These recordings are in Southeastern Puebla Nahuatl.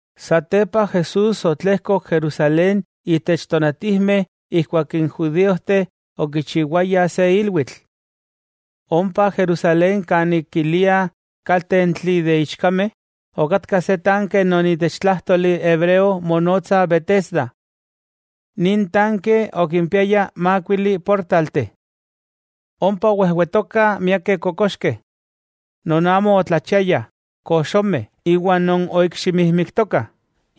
Satepa Jesús otlejkok Jerusalén itech tonatijmeh ijkuak n judíojteh okichiwayah se ilwitl. Ompa Jerusalén kanik kiliah kaltentli de ichkameh, okatka se tanke non itech tlájtoli hebreo monotsa Betesda. Nin tanke okimpiaya mákuili portalteh. Ompa owejwetokah miakeh kokoxkeh: non amo otlachiayah, koxomeh iwa non oikximijmiktokah,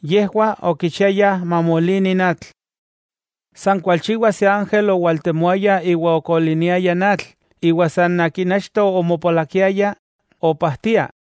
yejwah okichiayah mamolini n atl. San kualchiwa se ángel owaltemoaya iwa okoliniaya n atl, iwa san akin achto omopolakiaya, opajtia.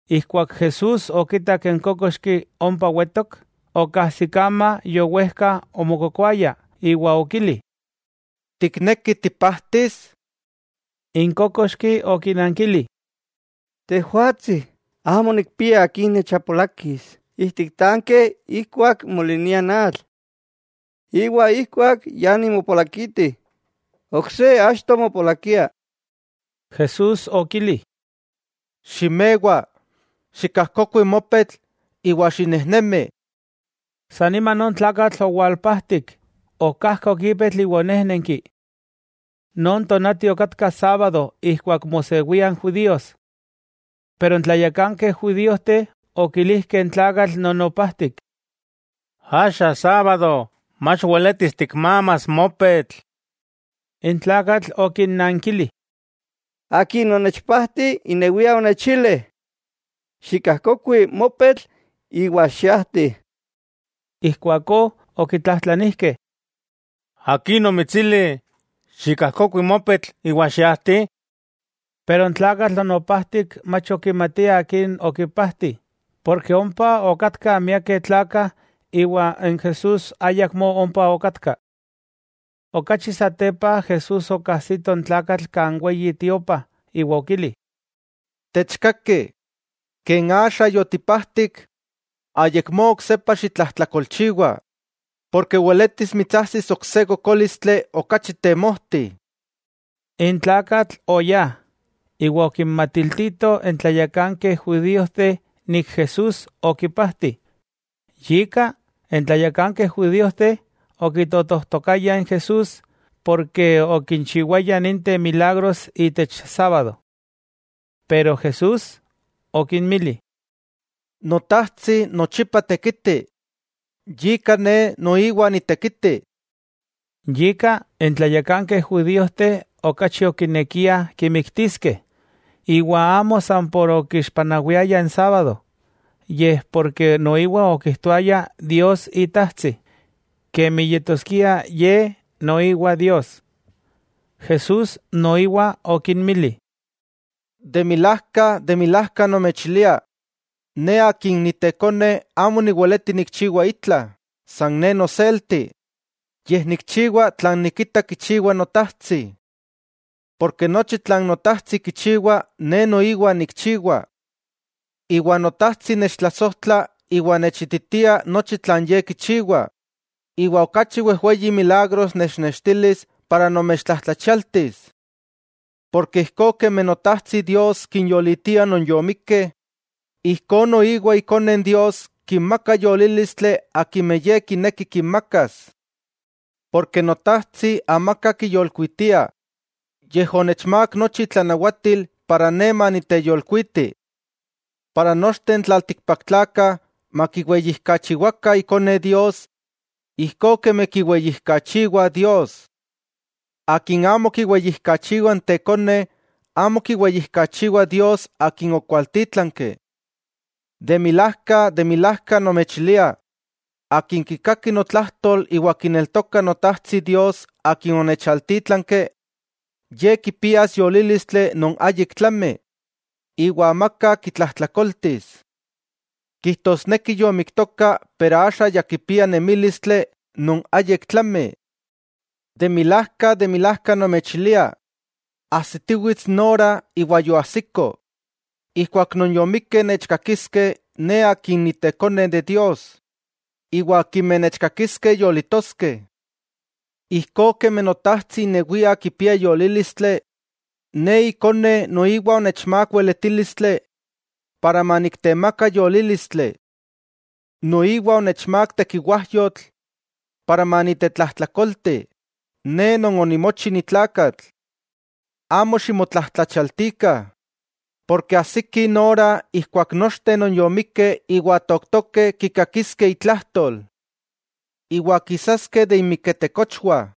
Ijkuak Jesús okitak n kókoxki ompa wetok, okajsikama yowejka omokokoaya, iwa okili: —¿Tikneki tipajtis? N kókoxki okinankili: —Tejwatsi, amo nikpia akin nechapolakis ijtik tanke ijkuak molinia n atl. Iwa ijkuak ya nimopolakiti, ok se achto mopolakia. Jesús okili: —Ximewa, xikajkokui mopetl iwa xinejnemi. San nima non tlakatl owalpajtik, okajkok ipetl iwa onéjnenki. Non tonati okatka sábado ijkuak mosewia n judíos. Pero n tlayakankeh judíojteh okilijkeh n tlakatl non opajtik: —Axa sábado, mach weletis tikmamas mopetl. N tlakatl okinnankili: —Akin onechpajti inewia onechili: “Xikajkokui mopetl iwa xiajti.” Ijkuakó okitlajtlanijkeh: —¿Akin omitsili: “Xikajkokui mopetl iwa xiajti”? Pero n tlakatl non opajtik mach okimatia akin okipajti, porke ompa okatkah miakeh tlakah iwa n Jesús ayakmó ompa okatka. Okachi satepa Jesús okajsito n tlakatl kan Weyi Tiopa iwa okili: —Techkaki, ken axa yotipajtik, ayakmó oksepa xitlajtlakolchiwa, porke weletis mitsajsis ok se kokólistli okachi temojti. N tlakatl oyá, iwa okinmatiltito n tlayakankeh judíojteh Jesús okipajti. Yika, n tlayakankeh judíojteh okitotojtokayah n Jesús porke okinchiwaya ninteh milagros itech sábado. Pero Jesús okinmili: —Notajtsi nochipa tekiti, yika Ne noiwa nitekiti. Yika, n tlayakankeh judíojteh okachi okinekiah kimiktiskeh, iwa amo san por okixpanawiaya n sábado yej porke noiwa okijtoaya Dios Itajtsi, kemi yetoskia Ye noiwa Dios. Jesús noiwa okinmili: —De milajka, de milajka nomechilia: Ne Akin Ni Tekone amo niweleti nikchiwa itla, san Ne noselti, yej nikchiwa tlan nikita kichiwa Notajtsi. Porke nochi tlan Notajtsi kichiwa Ne noiwa nikchiwa. Iwa Notajtsi nechtlasojtla iwa nechititia nochi tlan Ye kichiwa, iwa okachi wejweyi milagros nechnextilis para nomechtlajtlachialtis. Porke ijkó kemi Notajtsi Dios kinyolitia non yomikkeh, ijkó noiwa ikone n Dios kinmaka yolílistli akimeh Ye kineki kinmakas. Porke Notajtsi amaka kiyolkuitia, yej onechmák nochi itlanawatil para Ne maniteyolkuiti, para nochteh n tlaltikpaktlakah makiweyijkachiwakah Ikone Dios ijkó kemi kiweyijkachiwah Dios. Akin amo kiweyijkachiwa n tekone, amo kiweyijkachiwa Dios akin okualtítlanki. 'De milajka, de milajka nomechilia: akin kikaki notlajtol iwa kineltoka Notajtsi Dios Akin onechaltítlanki, ye kipias yolílistli non ayik tlami iwa amaka kitlajtlakoltis. Kijtosneki yomiktoka pero axa ya kipia nemílistli non ayik tlami. De milajka, de milajka nomechilia: ajsitiwits n ora, iwa yoajsiko, ijkuak non yomikkeh nechkakiskeh Ne Akin Ni Tekone de Dios, iwa akimeh nechkakiskeh yolitoskeh. Ijkó kemi Notajtsi inewia kipia yolílistli, Ne Ikone noiwa onechmák weletílistli para maniktemaka yolílistli. Noiwa onechmák tekiwájyotl para manitetlajtlakolti, Ne Non onimochi ni tlakatl. Amo ximotlajtlachialtikah, porke ajsiki n ora ijkuak nochteh non yomikkeh iwa tooktokeh kikakiskeh itlajtol. Iwa kisaskeh de inmiketekochwah.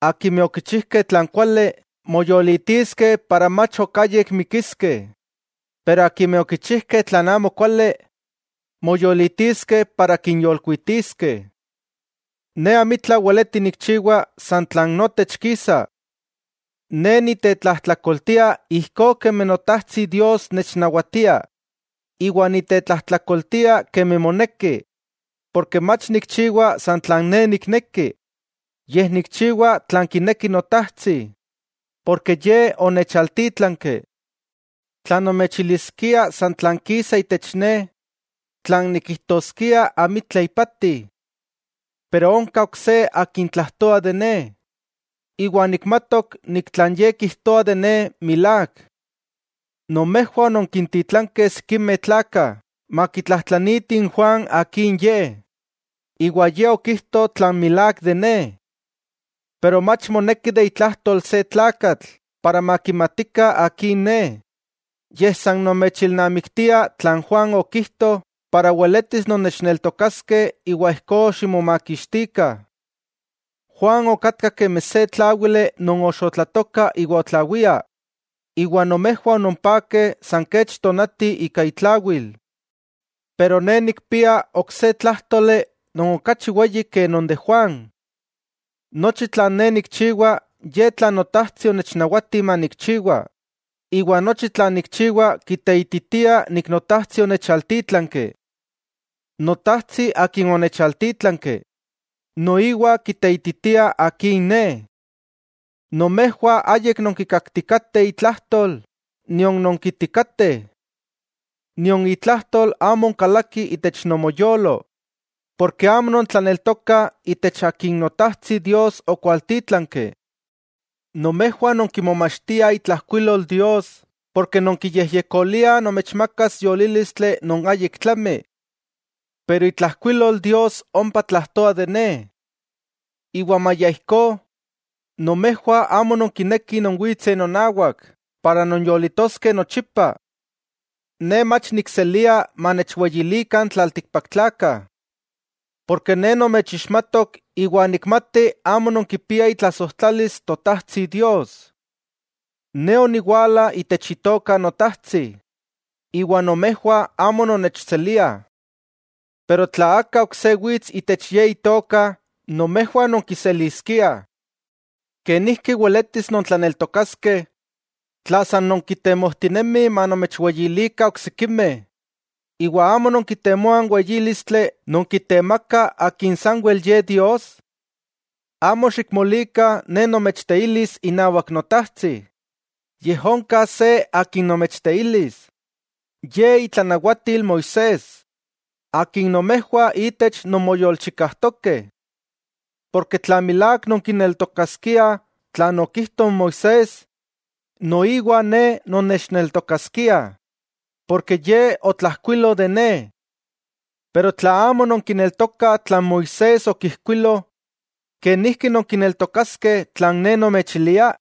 Akimeh okichijkeh tlan kuali, moyolitiskeh iwa mach ok ayik mikiskeh, iwa akimeh okichijkeh tlan amokuali, moyolitiskeh para kinyolkuitiskeh. 'Ne amitla weleti nikchiwa san tlan notech kisa. Ne nitetlajtlakoltia ijkó kemi Notajtsi Dios nechnawatia, iwa nitetlajtlakoltia kemi moneki, porke mach nikchiwa san tlan ne nikneki, yej nikchiwa tlan kineki Notajtsi Akin onechaltítlanki. Tla nomechiliskia san tlan kisa itech ne, tlan nikijtoskia amitla ipati. Pero onka ok se akin tlajtoa de Ne, iwa nikmatok nik tlan Ye kijtoa de Ne milák. Nomejwah ononkintitlankeh sikimeh tlakah makitlajtlanitih n Juan akin ye, iwa ye okijto tlan milák de Ne. Pero mach moneki aka tlakatl para makimatikah akin Ne; yej san nomechilnamiktia tlan Juan okijto para weletis nonnechneltokaskeh iwa ijkó ximomakixtikah. Juan okatka kemi se tláwili non oxotlatoka iwa otlawia, iwa nomejwah ononpakeh san kech tonati ika itlawil. Pero Ne nikpia ok se tlájtoli non okachi weyi ke non de Juan: Nochi tlan Ne nikchiwa ye tlan Notajtsi onechnawati manikchiwa, iwa nochi tlan nikchiwa kiteititia nik Notajtsi onechaltítlanki. Notajtsi Akin onechaltítlanki, noiwa kiteititia Akin Ne. Nomejwah ayik nonkikaktikateh itlajtol, nion nonkiitikateh, nion itlajtol amo onkalaki itech nomoyolo, porke amo nontlaneltokah Itech Akin Notajtsi Dios okwaltítlanki. Nomejwah nonkimomachtiah itlajkuilol Dios porke nonkiyejyekoliah nomechmakas yolílistli non áyik tlami. Pero itlajkuilol Dios ompa tlajtoa de Ne, iwa maya ijkó, nomejwah amo nonkinekih nonwitseh nonawak para nonyolitoskeh nochipa. 'Ne mach nikselia manechweyilikah n tlaltikpaktlakah. Porke Ne nomechixmatok iwa nikmati amo nonkipiah itlasojtlalis Totajtsi Dios. Ne oniwala itech itoka Notajtsi iwa nomejwah amo nonnechseliah. Pero tla aka ok se wits itech ye itoka, nomejwah nonkiseliskiah. ¿Kenijki weletis nontlaneltokaskeh, tla san nonkitemojtinemih manomechweyilikah oksikimeh iwa amo nonkitemoah n weyílistli non kitemaka Akin sanwel Ye Dios? Amo xikmolikah Ne nomechteilis inawak Notajtsi, yej onka se akin nomechteilis, ye itlanawatil Moisés, akin nomejwah itech nonmoyolchikajtokeh. Porke tla milák nonkineltokaskiah tlan okijto n Moisés, noiwa Ne nonnechneltokaskiah, porke ye otlajkuilo de Ne. Pero tla amo nonkineltokah tlan Moisés okijkuilo, ¿kenijki nonkineltokaskeh tlan Ne nomechilia?